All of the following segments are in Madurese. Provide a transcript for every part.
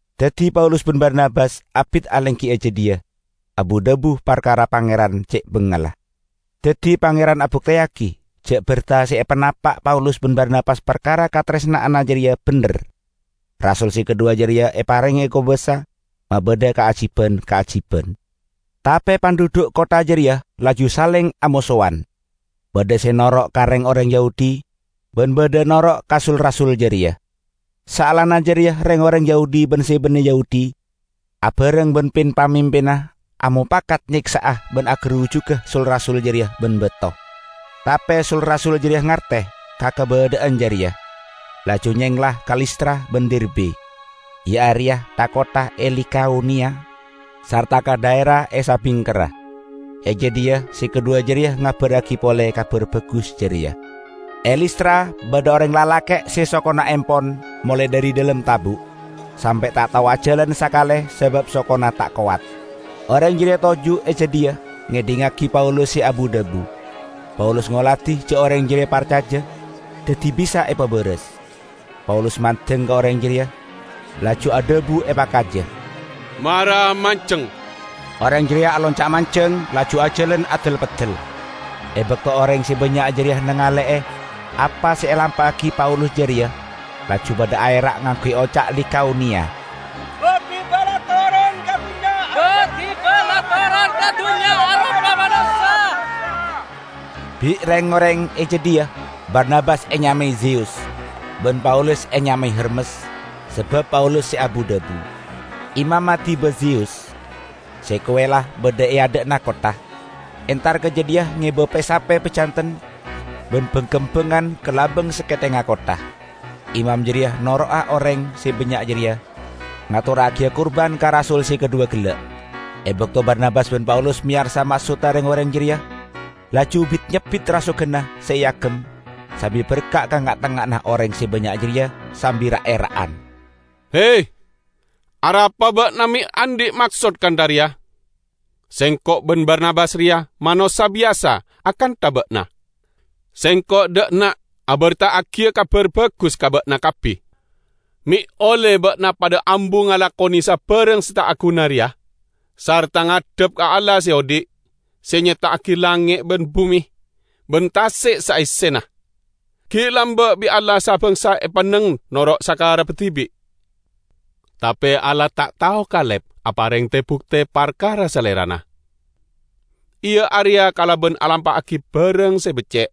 Daddi Paulus ban Barnabas abit alenggi e jadhiya, abu-dhabu parkara Pangeran ce' bangalla. Daddi Pangeran abukteyagi ja' berta se epanapa' Paulus ban Barnabas parkara kataresna'anna jareya bendher; rasul se kadhuwa jareya eparenge kobasa mabadha kaajiban-kaajiban. Tape pandhudhu' kottha jareya laju saleng amosowan; badha se noro' ka reng-oreng Yahudi ban badha noro' ka sul-rasul jareya. Saellana jareya reng-oreng Yahudi ban se banne Yahudi, abareng ban pin-pamimpinna amopakat nyeksa'a ban agarujuga sul-rasul jareya ban bato. Tape sul-rasul jareya ngarte ka kabadha'an jareya, laju nyengla ka Listra ban Derbe, iya areya tha-kottha e Likaoniya, sarta ka dhaera e sabingkerra. E jadhiya se kadhuwa jareya ngabarragi pole Kabar Bagus jareya. E Listra badha oreng lalake' se sokona empon molae dhari dhalem tabu', sampe' ta' tao ajalan sakale sabab sokona ta' kowat. Oreng jareya toju' e jadhiya ngedhingngagi Paulus se abu-dhabu. Paulus ngoladi ja' oreng jareya parcaja, daddi bisa epabaras. Paulus mandeng ka oreng jareya laju adhabu epakaja, "Mara manjeng!" Oreng jareya alonca' manjeng laju ajalan adel-peddel. E bakto oreng se bannya' jareya nangale'e apa se elampa'agi Paulus jareya, laju padha aera' ngangguy oca' Likaoniya, "Ba-diba la toron ka dunnya aropa manossa." Bi' reng-oreng e jadhiya Barnabas enyamae Zeyus, ban Paulus enyamae Hermes, sabab Paulus se abu-dhabu. Imamma Diba Zeyus, se kowella badha e adha'na kottha, entar ka jadhiya ngeba pe-sape pajanten ban bang-kembangan ka labang sakethengnga kottha. Imam jareya noro'a oreng se bannya' jareya ngatorragiya kurban ka rasul se kadhuwa gella'. E bakto Barnabas ban Paulus meyarsa maksodda reng-oreng jareya, laju bit-nyebbit rasoganna se eagem sambi berka' ka nga'-tengnga'anna oreng se bannya' jareya sambi ra'-era'an, "He, arapa ba'na me' andhi' maksod kantha reya? Sengko' ban Barnabas reya manossa biyasa akantha ba'na! Sengko' dha' enna' aberta'agiya Kabar Bagus ka ba'na kabbi, me' olle ba'na padha ambu ngalakone sabarang se ta' aguna reya sarta ngadhep ka Allah se odhi', se nyepta'agi langnge' ban bume ban tase' saessena. Gi' lamba' bi' Allah sa-bangsa epanneng noro' sakarebba dibi'. Tape Allah ta' tao kalep apareng te-bukte parkara Salerana, iya areya kalaban alampa'agi barang se becce'.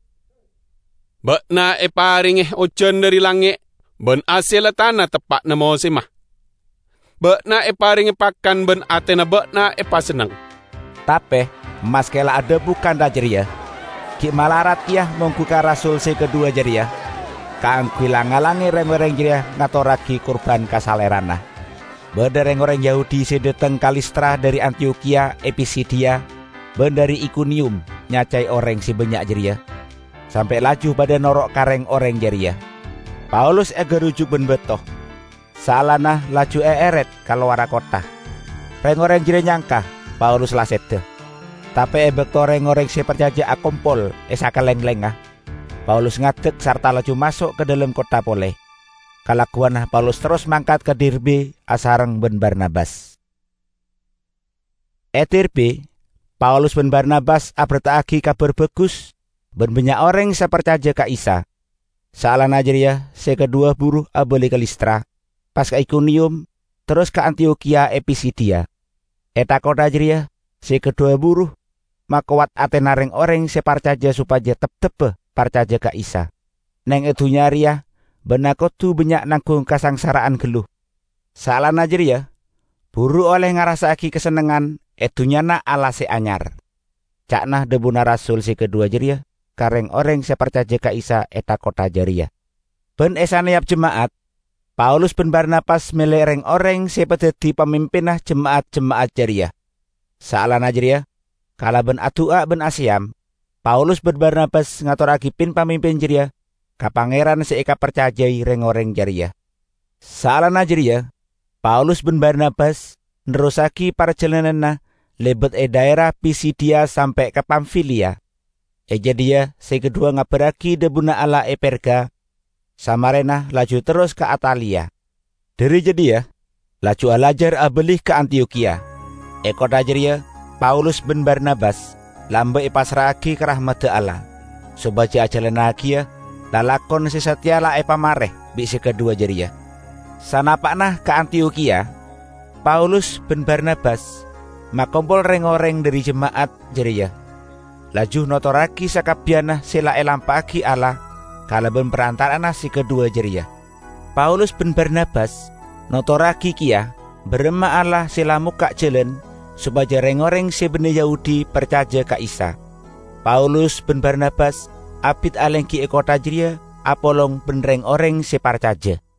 Ba'na eparenge ojan dhari langnge' ban hasella tana teppa'na mosemma. Ba'na eparenge pakan ban atena ba'na epasenneng." Tape maske la adhabu kantha jareya gi' malarat keya monggu ka rasul se kadhuwa jareya kaangguy lang-ngalange reng-oreng jareya ngatorragi kurban ka salerana. Badha reng-oreng Yahudi se dhateng ka Listra dhari Antiyokhiya e Pisidiya ban dhari Ikoniyum nyacae oreng se bannya' jareya sampe' laju padha noro' ka reng-oreng jareya. Paulus egarujuk ban bato, saellana laju eeret ka lowarra kottha. Reng-oreng jareya nyangka Paulus la seda, tape e bakto reng-oreng se parcaja akompol e sakalenglengnga, Paulus ngadek sarta laju maso' ka dhalem kottha pole. Kalagguwanna Paulus terros mangkat ka Derbe asareng ban Barnabas. E Derbe, Paulus ban Barnabas aberta'agi Kabar Bagus ban bannya' oreng se parcaja ka Isa. Saellana jareya se kadhuwa buru abali ka Listra, pas ka Ikoniyum, terros ka Antiyokhiya e Pisidiya. E tha-kottha jareya se kadhuwa buru makowat atena reng-oreng se parcaja sopaja teptebba parcaja ka Isa. "Neng e dunnya reya ba'na kodu bannya' nanggung kasangsara'an gallu, saellana jareya buru olle ngarassa'agi kasennengngan e Dunnyana Allah Se Anyar," ca'na dhabuna rasul se kadhuwa jareya ka reng-oreng se parcaja ka Isa e tha-kottha jareya. Ban e saneyap jema'at, Paulus ban Barnabas mele reng-oreng se epadaddi pamimpinna jema'at-jema'at jareya. Saellana jareya, kalaban adu'a ban aseyam, Paulus ban Barnabas ngatorragi pin-pamimpin jareya ka Pangeran se ekaparcajai reng-oreng jareya. Saellana jareya Paulus ban Barnabas nerrossagi parjalananna lebat e dhaera Pisidiya sampe' ka Pamfiliya. E jadhiya se kadhuwa ngabarragi dhabuna Allah e Perga, samarena laju terros ka Ataliya. Dhari jadhiya laju alajar abali ka Antiyokhiya. E kottha jareya Paulus ban Barnabas lamba' epassra'agi ka rahmadda Allah, sopaja ajalannagiya lalakon se sateya la epamare bi' se kadhuwa jareya. Sanapa'na ka Antiyokhiya, Paulus ban Barnabas makompol reng-oreng dhari jema'at jareya, laju notorragi sakabbiyanna se la elampa'agi Allah kalaban parantara'anna se kadhuwa jareya. Paulus ban Barnabas notorragi keya baramma Allah se la mokka' jalan sopaja reng-oreng se banne Yahudi parcaja ka Isa. Paulus ban Barnabas abit alenggi e kottha jareya apolong ban reng-oreng se parcaja.